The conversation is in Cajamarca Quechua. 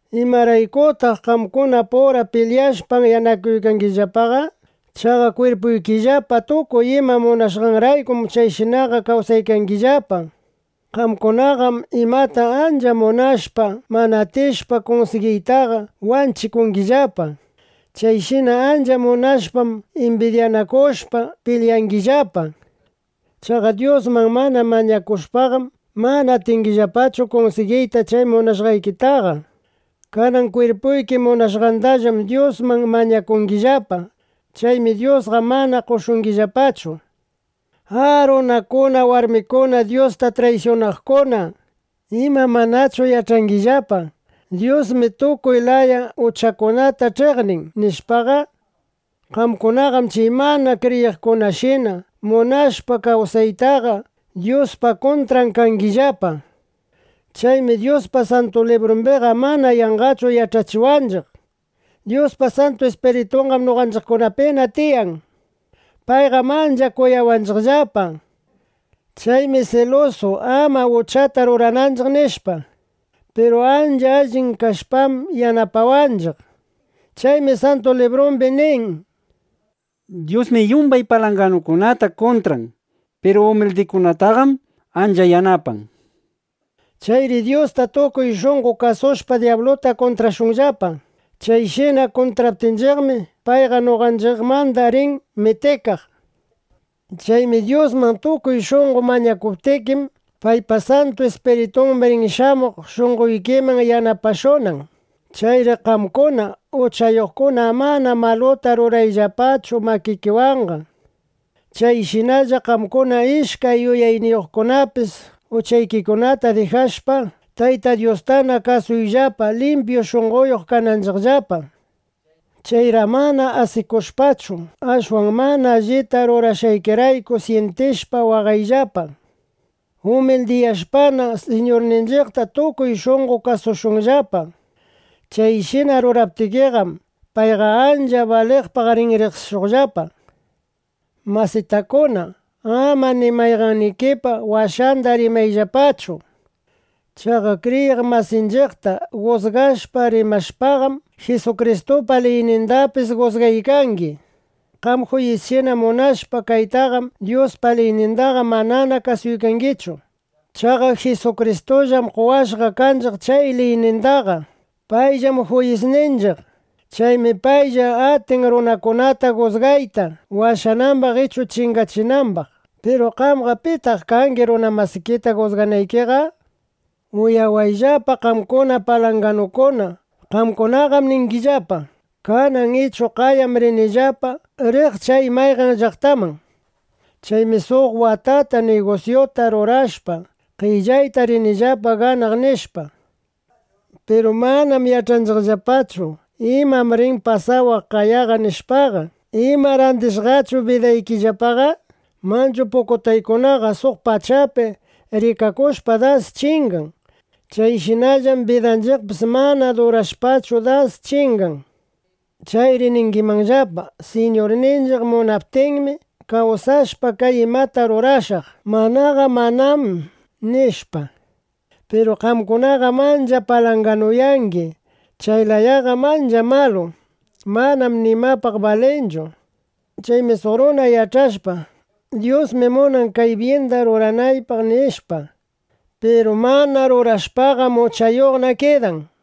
¿Imaraykutaq qamkunapura pilyashpa, anyanakungillapaqa? Chaqa kwirpuykillapa tukuy ima munashqanraykum chayshinaqa kawsangillapa. Qamkunaqam imata ancha munashpa, mana atishpa kunsigiytaqa wanchikungillapa. Chayshina ancha munashpam, imbidyanakushpa pilyangillapa. Chaqa Dyusman mana mañakushpaqam, mana atingillapachu kunsigiyta chay munashqaykitaqa. Kanan kwirpuyki munashqandallam Dyusman mañakungillapa. Chaymi Dyusqa mana qoshungillapachu. ¡A, runakuna, warmikuna Dyusta traysyunaqkuna! ¿Ima, manachu yach'angillapa: Dyusmi tukuy laya uchakunata ch'iqnin, nishpaqa? Qamkunaqam chay mana kriyiqkunashina munashpa kawsaytaqa, Dyuspa kuntran kangillapa. Chaymi Dyuspa Santu Librumbiqam mana yanqachu yach'achiwanchiq: “Dyuspa Santu Ispiritunqam noqanchiqkunapi tiyan. Payqam ancha kuyawanchiqllapa. Chaymi silusu, ama uchata rurananchiq”, nishpa. Piru ancha allin kashpam, yanapawanchiq. Chaymi Santu Librumbi nin: “Dyusmi yumbay palanganuta kuntran. Piru umildikunataqam ancha yanapan”, nishpa. Chayri Dyusta tukuy shunqo kasushpa, dyabluta kuntrashunllapa. Chayshina kuntraptinchiqmi, payqa noqanchiqmanda rin mitikaq. Chaymi Dyusman tukuy shunqo mañakuptikim, paypa Santu Ispiritun rin shamuq shunqoykiman yanapashunan. Chayri qamkuna uchayuqkuna amana maluta rurayllapachu makikiwanqa. Chayshinalla qamkuna ishkay yuyayniyuqkunapis uchaykikunata dijashpa, Tayta Dyustana kasuyllapa, limpyu shunqoyuq kanaykillapa. Chayri amana asikushpachu, ashwan mana allita rurashqaykirayku syintishpa, waqayllapa. Umildiyashpana, Siñurninchiqta tukuy shunqo kasuyllapa. Chayshina ruraptikiqam, payqa ancha baliqpaq rin riqsishuqllapa. Masitakuna, ama ni mayqannikipa washanda rimayllapachu. Chaqa kriyiq masinchiqta jusgashpa rimashpaqam, Jisukristupa liynindapis jusgaykangi. Qam juyisshina munashpa kaytaqam, Dyuspa liynindaqa manana kasuykangichu. Chaqa Jisukristullam qowashqa kanchiq chay liynindaqa. Payllam juyisninchiq. Chaymi paylla atin runakunata jusgayta, washanambaq ichu chingachinambaq. Piru qamqa, ¿pitaq kangi runa masikita jusganaykiqa? Uyawayllapa qamkuna palanganukuna. Qamkunaqam ningillapa: “Kanan ichu qayam rinillapa riq chay mayqan llaqtaman. Chaymi suq watata nigusyuta rurashpa, qellayta rinillapa ganaq”, nishpa. Piru manam yach'angillapachu: ¿Imam rin pasawaqllapa qaya? nishpaqa. ¿Ima randishqachu bidaykillapaqa? Manchu pukutaykunaqa suq pachapi rikakushpa, das chingan. Chayshinallam bidanchiqpis mana durashpachu, das chingan. Chayri ningimanllapa: “Siñurninchiq munaptinmi, kawsashpa kay imata rurashaq; manaqa manam”, nishpa. Piru qamkunaqam ancha palanganuyangi. Chay layaqam ancha malu. Manam nimapaq balinchu. Chaymi suq runa yach'ashpa: Dyusmi munan kay byinda ruranaypaq, nishpa, piru mana rurashpaqam, uchayuqna kidan.